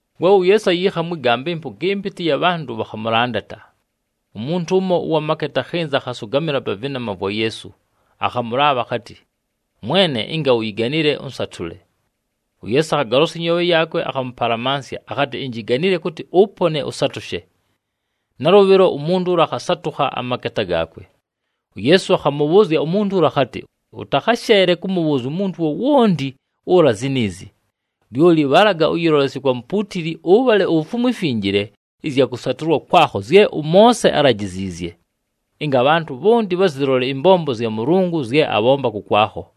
We uYeesu ayiikha mwɨ gamba, ɨmpʉga ɨmpɨtɨ ɨya bhantʉ bhakhamʉlandata. Umuntu ʉmo ʉwa maketa akhɨnza, akhasʉgamɨla pa vɨnama vwa Yeesu, akhamʉlaabha akhatɨ, “Mwene, ɨnga uyiganile, ʉnsatʉle.” UYeesu akhagolosya ɨnyoobhe yaakwe, akhamʉpalamansya, akhatɨ, “Injiganile kʉtɨ ʉpone, ʉsatʉshe!” Nalʉbhɨlo umuntu ʉla akhasatʉkha amaketa gaakwe. UYeesu akhamʉbhʉʉzya umuntu ʉla akhatɨ, “Ʉtakhasheele kʉmʉbhʉʉzya umuntu wowonti ʉla ziniizi. Lyoli bhalaga ʉyɨlolesye kwa mupuutili, ʉbhale ufumwe imfinjile ɨzya kʉsatʉlwa kwakho zye ʉMoose álajiziizye, ɨnga abhantʉ bhonti bhazɨlole ɨmbombo zya Mʉlʉngʉ zye abhomba kʉkwakho.”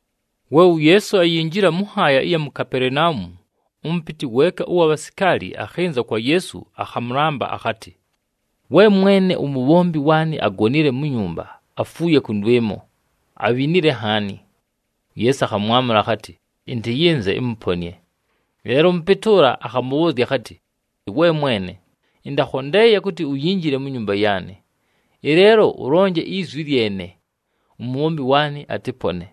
We uYeesu ayinjila mʉ nhaaya ɨya mu Kapelenaumu, ʉmʉpɨtɨ weeka ʉwa bhasikaali akhɨnza kwa Yeesu akhamʉlamba, akhatɨ, “We Mwene, umubhombi waanɨ agonile mu nyumba, afuuye kʉndwɨmo, abhinile nhaani.” UYeesu akhamwamʉla akhatɨ, “Ɨntɨyɨnze ɨmʉponɨe.” Ɨleelo ʉmʉpɨtɨ ʉla akhamʉbhʉʉzya akhatɨ, “We Mwene! Ɨntakhondeeye kʉtɨ uyinjile mu nyumba yaanɨ. Ɨleelo ʉlonje izwi lyene, umubhombi waanɨ atɨpone.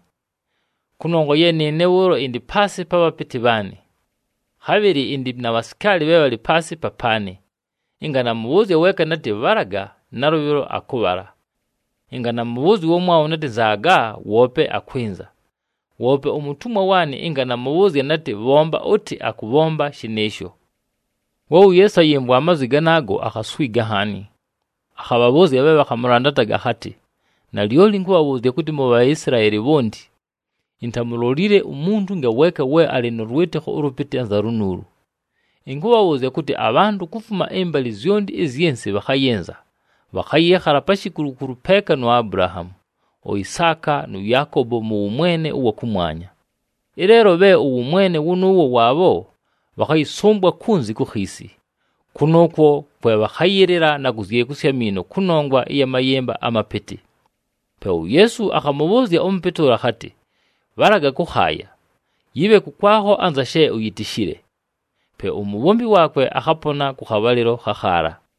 Kʉnongwa ye nɨɨne bhʉʉlo ɨndɨ paasɨ pa bhapɨtɨ bhaanɨ. Khabhɨlɨ ɨndɨ na bhasikaali bhe bhalɨ paasɨ papaanɨ. Ɨnga namʉbhʉʉzya weeka natɨ, ‘Bhalaga!’, nalʉbhɨlo akʉbhala. Ɨnga namʉbhʉʉzya ʉwamwabho natɨ, ‘Nzaaga!’, woope akwɨnza. Woope umutumwa waanɨ ɨnga namʉbhʉʉzya natɨ, ‘Bhomba ʉtɨ!’, akʉbhomba shɨnɨɨsho.” We uYeesu ayɨmvwa amazwi ganaago, akhaswiga nhaani, akhabhabhʉʉzya bhe bhakhamʉlandataga akhatɨ, “Nalyoli ɨnkʉbhabhʉʉzya kʉtɨ, mu Bhaisilaeli bhonti, intamulolile umuntu ngaweeka we alɨ nʉ lwɨtɨkho ʉlʉpɨtɨ anza lunuulu! Ɨnkʉbhabhʉʉzya kʉtɨ, abhantʉ kufuma ɨmbalɨ zyonti ɨzyɨ nsɨ bhakhayɨnza, bhakhayɨɨkhala pa shikulukulu peeka nu Abulahaamu, uIsaaka nʉ Yaakobo mʉ wʉmwene ʉwa kʉmwanya. Ɨleelo bhe ʉwʉmwene wʉnʉʉwo waabho, bhakhayɨsʉmbwa kunzi ku khiisi. Kʉnʉʉkwo kwe bhakhayɨlɨla na kuzyekusya amiino kʉnongwa ya mayɨmba amapɨtɨ!” Pe uYeesu akhamʉbhʉʉzya ʉmʉpɨtɨ ʉla akhatɨ, “Bhalaga kʉkhaaya! Yɨbhe kʉkwakho anza she uyitishile.” Pe umubhombi waakwe akhapona kʉ khabhalɨlo khakhaala.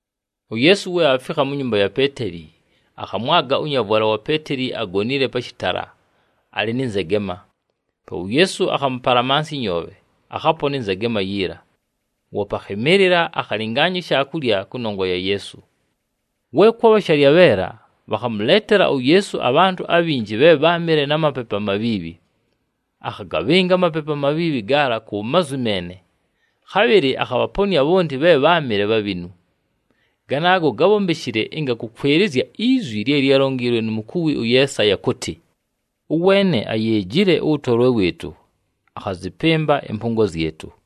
UYeesu we aafikha mu nyumba ya Peeteli, akhamwaga ʉnyavwala wa Peeteli agonile pa shɨtala, alɨ nɨ nzegema. Pe uYeesu akhamʉpalamansya ɨnyoobhe, akhapona ɨnzegema yiila. Woope akhɨmɨɨlɨla, akhalɨngaanya ishaakulya kʉnongwa ya Yeesu. We kwabha shalyabheela, bhakhamʉleetela uYeesu abhantʉ abhinji bhe bháamɨle na mapepu amabhiibhi. Akhagabhɨnga amapepu amabhiibhi gaala ku mazwi meene. Khabhɨlɨ akhabhaponɨa bhonti bhe bháamɨle bhabhinu. Ganaago gábhombeshile ɨnga kʉkwɨlɨzya izwi lye lyálonjiilwe nu mukuwi ʉYeesaya kʉtɨ, “Ʉweene ayeejile ʉwʉtolwe wɨɨtʉ, akhazɨpɨmba ɨmpʉngo zyɨtʉ.”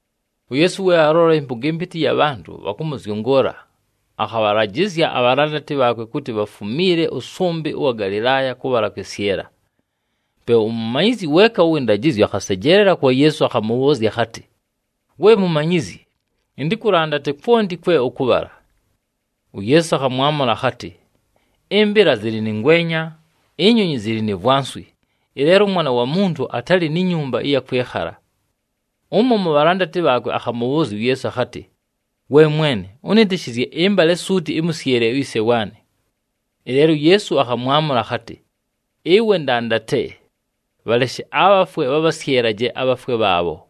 UYeesu we aalola ɨmpʉga ɨmpɨtɨ ɨya bhantʉ bhakʉmʉzyʉngʉʉla, akhabhalajɨzya abhalandati bhaakwe kʉtɨ bhafumiile ʉsʉmbɨ ʉwa Galɨlaaya kʉbhala kwɨsyɨla. Pe umumanyizyi weeka ʉwɨ ndajɨzyo akhasejeelela kwa Yeesu, akhamʉbhʉʉzya akhatɨ, “We Mumanyizyi, ɨntɨkʉlandate kwonti kwe ʉkʉbhala.” UYeesu akhamwamʉla akhatɨ, “Ɨmbɨla zɨlɨ nɨ ngwenya, inyonyi zɨlɨ ni vwanswi, ɨleelo ʉMwana wa Muntu atalɨ ni nyumba ɨya kwɨkhala!” Ʉmo mu bhalandati bhaakwe akhamʉbhʉʉzya uYeesu akhatɨ, “We Mwene, ʉnɨtɨshɨzye ɨmbale suuti, ɨmʉsyɨle uyise waanɨ.” Ɨleelo uYeesu akhamwamʉla akhatɨ, “Ɨwe ndandate! Bhaleshe abhafwe bhabhasyɨlaje abhafwe bhaabho.”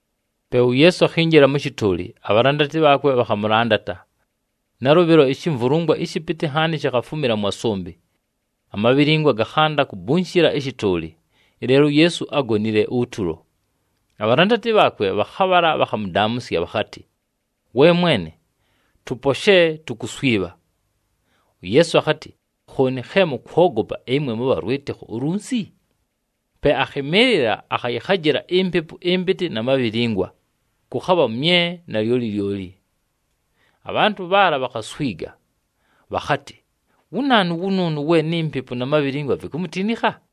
Pe uYeesu akhinjila mʉ shɨtʉʉlɨ, abhalandati bhaakwe bhakhamʉlandata. Nalʉbhɨlo ishimvulungwa ɨshɨpɨtɨ nhaani shikhafumila mwa sʉmbɨ, amabhilingwa gakhanda kugubishila ɨshɨtʉʉlɨ. Ɨleelo uYeesu ágonile utulo. Abhalandati bhaakwe bhakhabhala bhakhamʉdaamʉsya, bhakhatɨ, “We Mwene! Tʉposhe! Tukuswibha!” UYeesu akhatɨ, “Khooni khe mʉkwogopa, ɨmwe mʉbha lwɨtɨkho ulunsi?” Pe akhɨmɨɨlɨla, akhayɨkhajɨla impepu ɨmpɨtɨ na mabhilingwa, kʉkhabha mye nalyoli lyoli. Abhantʉ bhaala bhakhaswiga, bhakhatɨ, “Wu naanu wʉnʉʉnʉ we ni mpepu na mabhilingwa vikumutinikha?”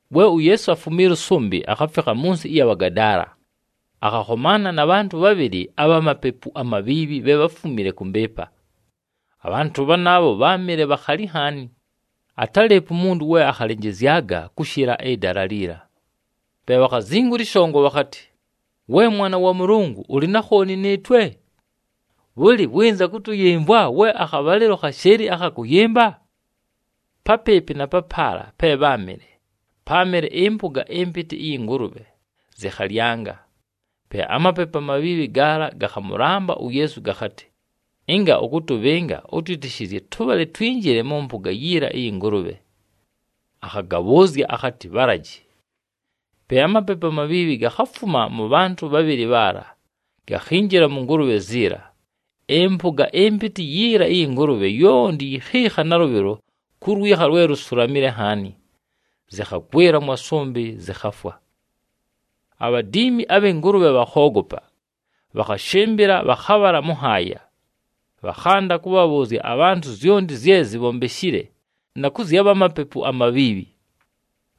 We uYeesu afumiila ʉsʉmbɨ, akhafikha mʉ nsɨ ɨya Bhagadaala. Akhakhomaana na bhantʉ bhabhɨlɨ abha mapepu amabhiibhi bhe bháfumile kʉ mbɨɨpa. Abhantʉ bhanaabho bháamɨle bhakhali nhaani, atálɨɨpo umuntu we akhalɨnjɨzyaga kʉshɨla ɨdala liila. Pe bhakhazingula ɨshongo bhakhatɨ, “We Mwana wa Mʉlʉngʉ, ʉlɨ na khooni nɨɨtwe? Bhʉlɨ, wɨnza kʉtʉyɨmvwa we akhabhalɨlo khashɨɨlɨ akha kʉyɨmba?” Papɨɨpɨ na papaala pe bháamɨle, páamɨle ɨmpʉga ɨmpɨtɨ ɨyɨ ngʉlʉbhe zɨkhalyanga. Pe amapepu amabhiibhi gaala gakhamʉlamba uYeesu gakhatɨ, “Ɨnga ʉkʉtʉbhɨnga, ʉtwɨtɨshɨzye tʉbhale twinjile mʉ mpʉga yiila ɨyɨ ngʉlʉbhe.” Akhagabhʉʉzya akhatɨ, “Bhalaji!” Pe amapepu amabhiibhi gakhafuma mʉ bhantʉ bhabhɨlɨ bhaala, gakhinjila mʉ ngʉlʉbhe ziila. Ɨmpʉga ɨmpɨtɨ yiila ɨyɨ ngʉlʉbhe yonti yikhiikha nalʉbhɨlo ku lwikha lwe lusulamile nhaani, zɨkhagwɨla mwa sʉmbɨ, zɨkhafwa. Abhadiimi abhɨ ngʉlʉbhe bhakhoogopa, bhakhashɨmbɨla, bhakhabhala mʉ nhaaya. Bhakhanda kʉbhabhʉʉzya abhantʉ zyonti zye zibhombeshile na kʉ zya bha mapepu amabhiibhi.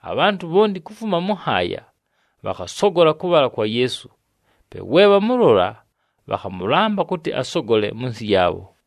Abhantʉ bhonti kufuma mʉ nhaaya, bhakhasogola kʉbhala kwa Yeesu. Pe we bhamʉlola, bhakhamʉlamba kʉtɨ asogole mʉ nsɨ yaabho.